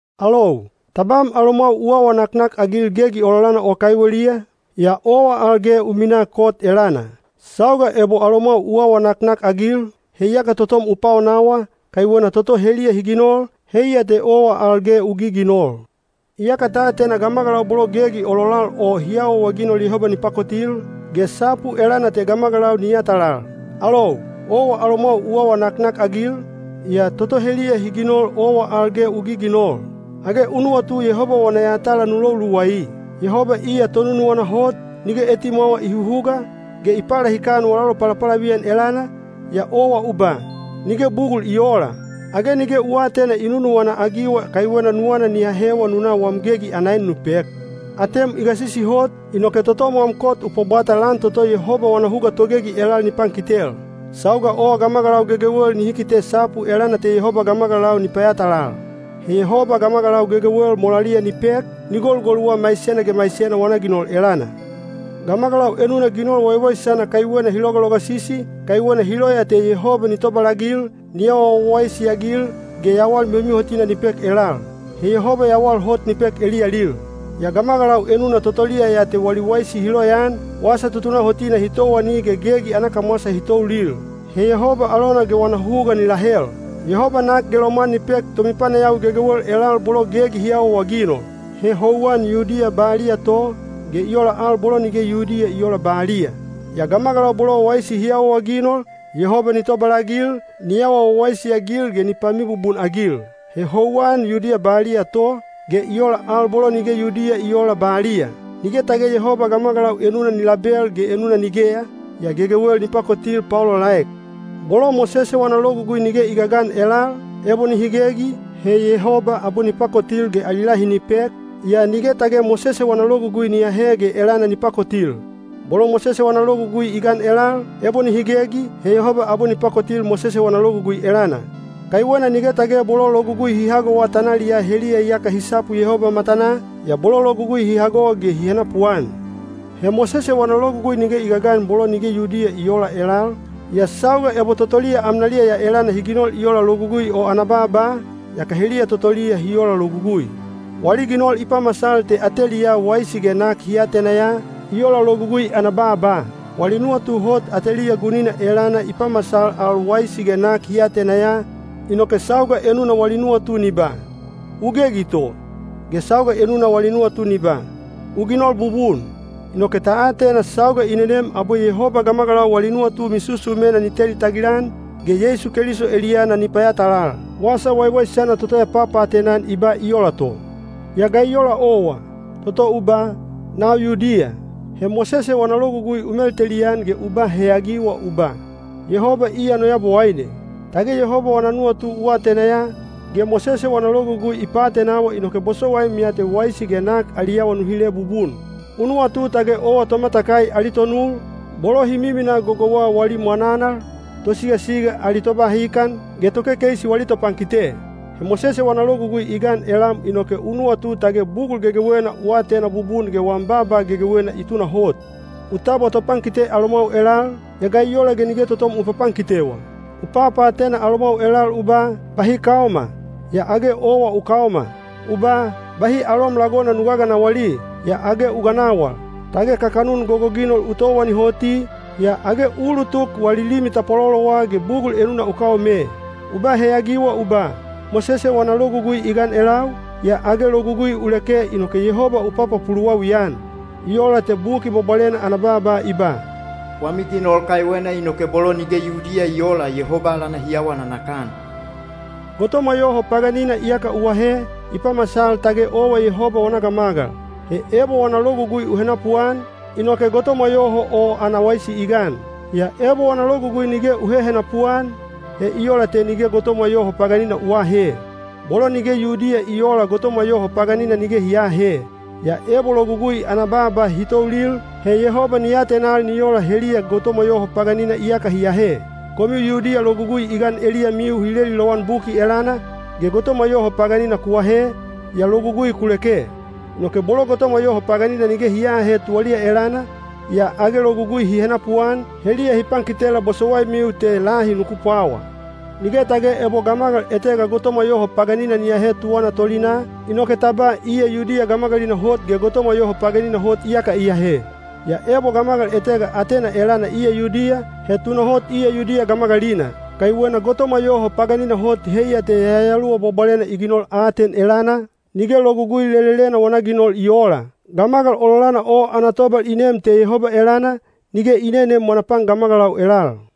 Alou, tabam alomwau u awa naknakagil gegi ololana o kaiweliya, yaa owa al ge u minaa kot elana. Sauga ebo alomwau u awa naknakagil, he yaka totom u paonawa, kaiwena toto heliya hi ginol, heiya te owa al ge u giginol. Iyaka ta atena gamagalau bolo gegi ololal o hi awaawaginol Yehoba ni pakotil, ge sapu elana te gamagalau ni yatalal. Alou, owa alomwau u awa naknakagil, yaa toto heliya hi ginol owa al ge u giginol. Age u nuwatu Yehoba wana yatala nu lou luwai? Yehoba iya tonunuwana hot, nige etimwawa i huhuga, ge i palahikan wala lopalapalaviyan elana, yaa owa u ba, “Nige bugul i oola.” Age nige u aatena i nunuwana-agiwa kaiwena nuwana ni ahewa nu na wam gegi ana en nu pek? Atem i gasisi hot, inoke totom wam kot u pwabwata lan toto Yehoba wana huga togegi elal ni pankitel. Sauga o gamagalau gegewel nihi kite sapu elana te Yehoba gamagalau ni payatalal. He Yehoba gamagalau gegewel molaliya ni pek, ni golugoluwa maisena ge maisena wana ginol elana. Gamagalau enuna ginol waiwaisana kaiwena hi logalogasisi, kaiwena hi loya te Yehoba ni tobalagil, ni awa wawaisi-agil ge yawal mihomihotina ni pek elal. He Yehoba yawal hot ni pek eliyalil. Yaa gamagalau enuna totoliya ya te wali waisi hi loyaan, wasa tutunahotina hi towani ge gegi ana kamwasa hi toulil. He Yehoba alona ge wana huga ni lahel. Yehoba nak ge lomwan ni pek tomipanayawi gegewel elal bolo gegi hi awaawaginol. He houwan Yudiya baliya to, ge i ola al bolo nige Yudiya i oola baliya. Yaa gamagalau bolo waisi hi awaawaginol, Yehoba ni tobalagil, ni awa wawaisi-agil ge ni pamibubun-agil. He houwan Yudiya baliya to, ge i ola al bolo nige Yudiya i oola baliya. Nige tage Yehoba gamagalau enuna ni label ge enuna nigeya, yaa gegewel ni pakotil paolaolaek. Bolo Mosese wana Logugui nige i gagan elal, ebo nihi gegi, he Yehoba abwe ni pakotil ge ali lahi ni pek, yaa nige tage Mosese wana Logugui ni ahe ge elana ni pakotil. Bolo Mosese wana Logugui i gan elal, ebo nihi gegi, he Yehoba abwe ni pakotil Mosese wana Logugui elana. Kaiwena nige tage bolo Logugui hi hagowa tanaliyaa heliya iyaka hi sapu Yehoba matanaa, yaa bolo Logugui hi hago ge hi henapuan. (He Mosese wana Logugui nige i gagan bolo nige Yudiya i oola elal, yaa sauga ebo totoliya amnaliya ya elana hi ginol i ola Logugui o ana baaba, yaka heliya totoliya hi ola logugui. Wali ginol i pamasal te ateliyaa waisi ge nak hi atena ya, i ola Logugui ana baaba. Wali nuwatu hot ateliya gunina elana i pamasal al waisi ge nak hi atena ya, inoke sauga enuna wali nuwatu ni ba, “U gegi to,” ge sauga enuna wali nuwatu ni ba, “U ginol bubun.”) Inoke ta atena sauga i nenem abwe Yehoba gamagalau wali nuwatu misusumena ni teli tagilan, ge Yeisu Keliso eliyana ni payatalal. Wasa Waiwaisana toto ya papaatena-an i ba i ola to. Yaa ga i ola owa, toto u ba “Nau Yudiya.” He Mosese wana Logugui u meltelian ge u ba heyagiwa u ba, “Yehoba iya no Yabowaine.” Tage Yehoba wana nuwatu u atena ya, ge Mosese wana Logugui i paatenawa inoke bosowaim ya te waisi ge nak ali awa nu hile bubun. U nuwatu tage owa tomatakai ali tonul, bolo hi miminaa gogouwa wali mwananal, tosigasiga ali tobahikan, ge tokekeisi wali topankite. He Mosese wana Logugui i gan elam inoke u nuwatu tage bugul gegewena u atena bubun ge wam baaba gegewena i tunahot. U tabwa topankite alomwau elal, yaa ga i ola ge nige totom u papankitewa? U papaatena alomwau elal u ba, “Bahi kaoma,” yaa age owa u kaoma. U ba, “Bahi alom lagona nu gaganawali,” yaa age u ganawal. Tage kakanun gogoginol u towani hoti, yaa age u ulutuk wali limi tapwalolowa ge bugul enuna u kaome. U ba heyagiwa u ba, “Mosese wana Logugui i gan elau,” yaa age logugui u leke inoke Yehoba u papapuluwawi-an. I ola te Buki Bwabwalena ana baaba i ba, “Wami ginol kaiwena inoke bolo nige Yudiya i oola Yehoba alana hi awa nanakan.” Gotomwa yoho paganina iyaka u ahe, i pamasal tage owa Yehoba wana gamagal. He ebo wana logugui u henapuan, inoke gotomwa yoho o ana waisi i gan. Yaa ebo wana logugui nige u hehenapu-an, he i ola te nige gotomwa yoho paganina u aahe. Bolo nige Yudiya i oola gotomwa yoho paganina nige hi aahe. Yaa ebo logugui ana baaba hi toulil, he Yehoba ni atenal ni ola heliya gotomwa yoho paganina iyaka hi ahe. Komiu Yudiya logugui i gan eliyamiu hi leli lowan Buki elana, ge gotomwa yoho paganina ku ahe, yaa logugui ku leke. Inoke bolo gotomwa yoho paganina nige hi aahe tuwaliya elana, yaa age logugui hi henapuan, heliya hi pankitela bosowaimiu te lahi nuku pwawa. Nige tage ebo gamagal etega gotomwa yoho paganina ni ahe tuwana tolinaa, inoke ta ba iya Yudiya gamagalina hot ge gotomwa yoho paganina hot iyaka i ahe. Yaa ebo gamagal etega atena elana iya Yudiya, he tunahot iya Yudiya gamagalina. Kaiwena gotomwa yoho paganina hot heiya te Yayaluwa Bwabwalena i ginol aten elana, nige Logugui lelelena wana ginol i oola. Gamagal ololana o ana tobal i neem te Yehoba elana, nige i neneem wana pan gamagalau elal.